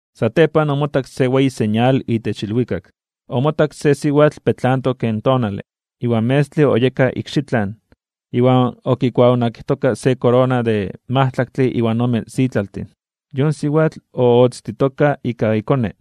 Satepan omotak se weyi señal itech ilwikak. Omotak se siwatl petlantok ken tonale, iwan in metztle oyeka ikxitlan, iwan okikuaonakijtoka se korona de majtlaktle iwan ome sitlaltin. Yon siwatl ootztitoka ika ikone,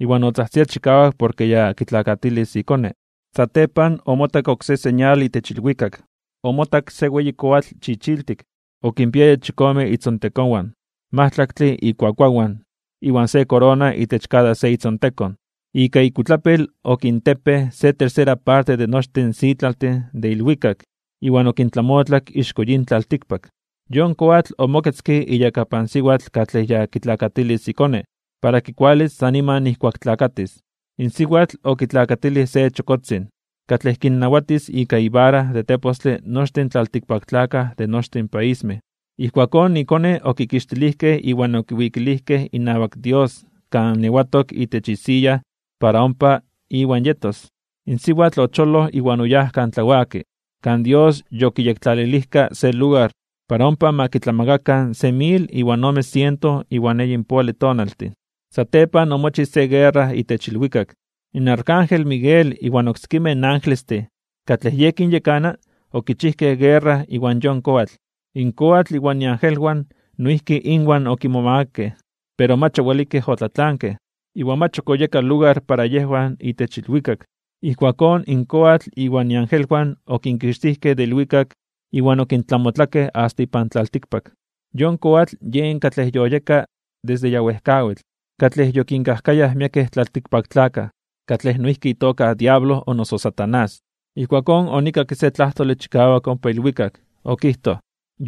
iwan otzajtzia chikawak porke ya tlakatis ikone. Satepan omotak oksé señal itech ilwikak. Omotak se weyi koatl chichiltik, okinpiaya chikome itzontekonwan, majtlaktle ikuakuawan, iwan se korona itech kada se itzontekon. Ika ikuitlapil okintepej se tercera parte de nochtin in sitlaltin de ilwikak iwan okintlamotlak ixko yin tlaltikpak. Yon koatl omoketzke iyakapan siwatl katlej ya kitlakatilis ikone, para kikualis san niman nijkuak tlakatis. In siwatl okitlakatilij se chokotzin, katlej kinnawatis ika ivara de tepostle nochtin in tlaltikpaktlakaj de nochtin paismej. Ijkuakón ikone okikixtilijkej iwan okiwikilijkej inawak Dios kan ewatok itech isiya para ompa Iwan yetos. In siwatl ocholoj iwan oyáj kan tlawaki, kan Dios yokiyektlalilijka se lugar para ompa ma kitlamakakan se mil iwan ome siento iwan eyinpoale tonaltin. Satepan omochij se guerra itech ilwikak. In arcángel Miguel iwan oksekimej angelestin katlej yej kinyekana okichijkej guerra iwan yon koatl. In koatl iwan iangelwan noijki inwan okimomagakej (omomakakej), pero mach owelikej otlatlankej, iwan mach ok oyeka lugar para yejwan itech ilwikak. Ijkuakón in koatl iwan iangelwan okinkixtijkej de ilwikak iwan okintlamotlakej asta ipan tlaltikpak. Yon koatl yen katlej yoyeka desde ya wejkawitl, katlej yokinkajkayaj miekej tlaltikpaktlakaj, katlej noijki itoka diablo o noso Satanás. Ijkuakón onikakke se tlajtole chikawak ompa ilwikak, okijtoj: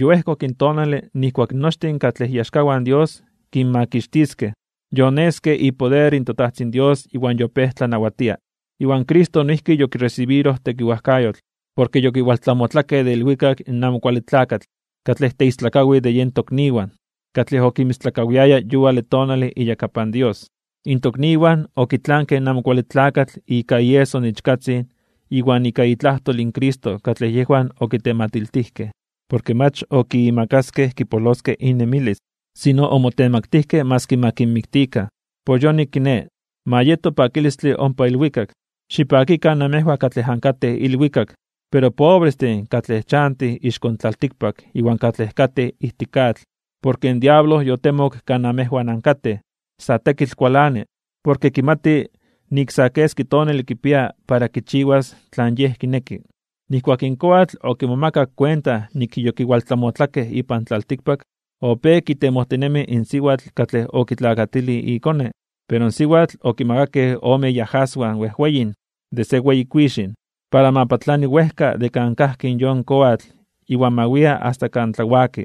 ―Yoejkok in tonale nijkuak nochtin katlej iaxkawan in Dios kinmakixtiskej, yoneske ipoder in toTajtzin Dios iwan yopéj tlanawatia. Iwan Cristo noijki yokiresibiroj tekiwajkayotl, porke yokiwaltlamotlakej de ilwikak in Amo Kuale Tlakatl katlej teistlakawij de yen tokniwan, katlej okinmistlakawiaya yuale tonale iyakapan Dios. In tokniwan okitlankej in Amo Kuale Tlakatl ika ieso in Ichkatzin iwan ika itlajtol Cristo katlej yejwan okitematiltijkej. Porke mach okimakaskej kipoloskej innemilis, sino omotemaktijkej (omotemaktilijkej) maski ma kinmiktikan. Por yonik kiné, ma yeto pakilistle ompa ilwikak. Xipakikan namejwan katlej ankatej ilwikak. Pero, pobrestin katlej chantij ixko tlaltikpak iwan katlej katej ijtik atl. Porke in diablo yotemok kan amejwan ankatej, sa tekitl kualani, porke kimati nik sa keski tonale kipia para kichiwas tlan yej kineki. Nijkuak in koatl okimomakak kuenta nik yokiwaltlamotlakej ipan tlaltikpak, opéj kitemojtinemi in siwatl katlej okitlakatilij ikone. Pero in siwatl okimakakej ome iajaswan wejweyin de se weyi kuixin (águila), para ma patlani wejka de kan kajki in yon koatl iwan ma wia asta kan tlawaki,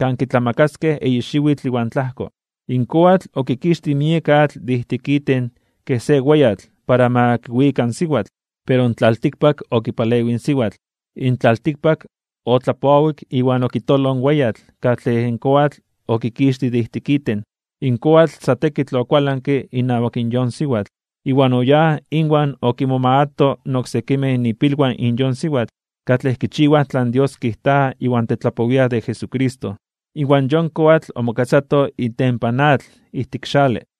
kan kitlamakaskej eyi xiwitl iwan tlajko. In koatl okikixtij miek atl de ijtik iten kej se weyatl para ma kiwika in siwatl. Pero in tlaltikpak okipalewij in siwatl. In tlaltikpak otlapowik iwan okitoloj in weyatl katlej in koatl okikixtij de ijtik iten. In koatl sa tekitl okualanke inawak in yon siwatl, iwan oyáj inwan okimomagato (okinmomakato) oksekimej ipilwan in yon siwatl, katlej kichiwaj tlan Dios kijta iwan tetlapowiaj de Jesucristo. Iwan yon koatl omoketzato itempan atl ijtik xale.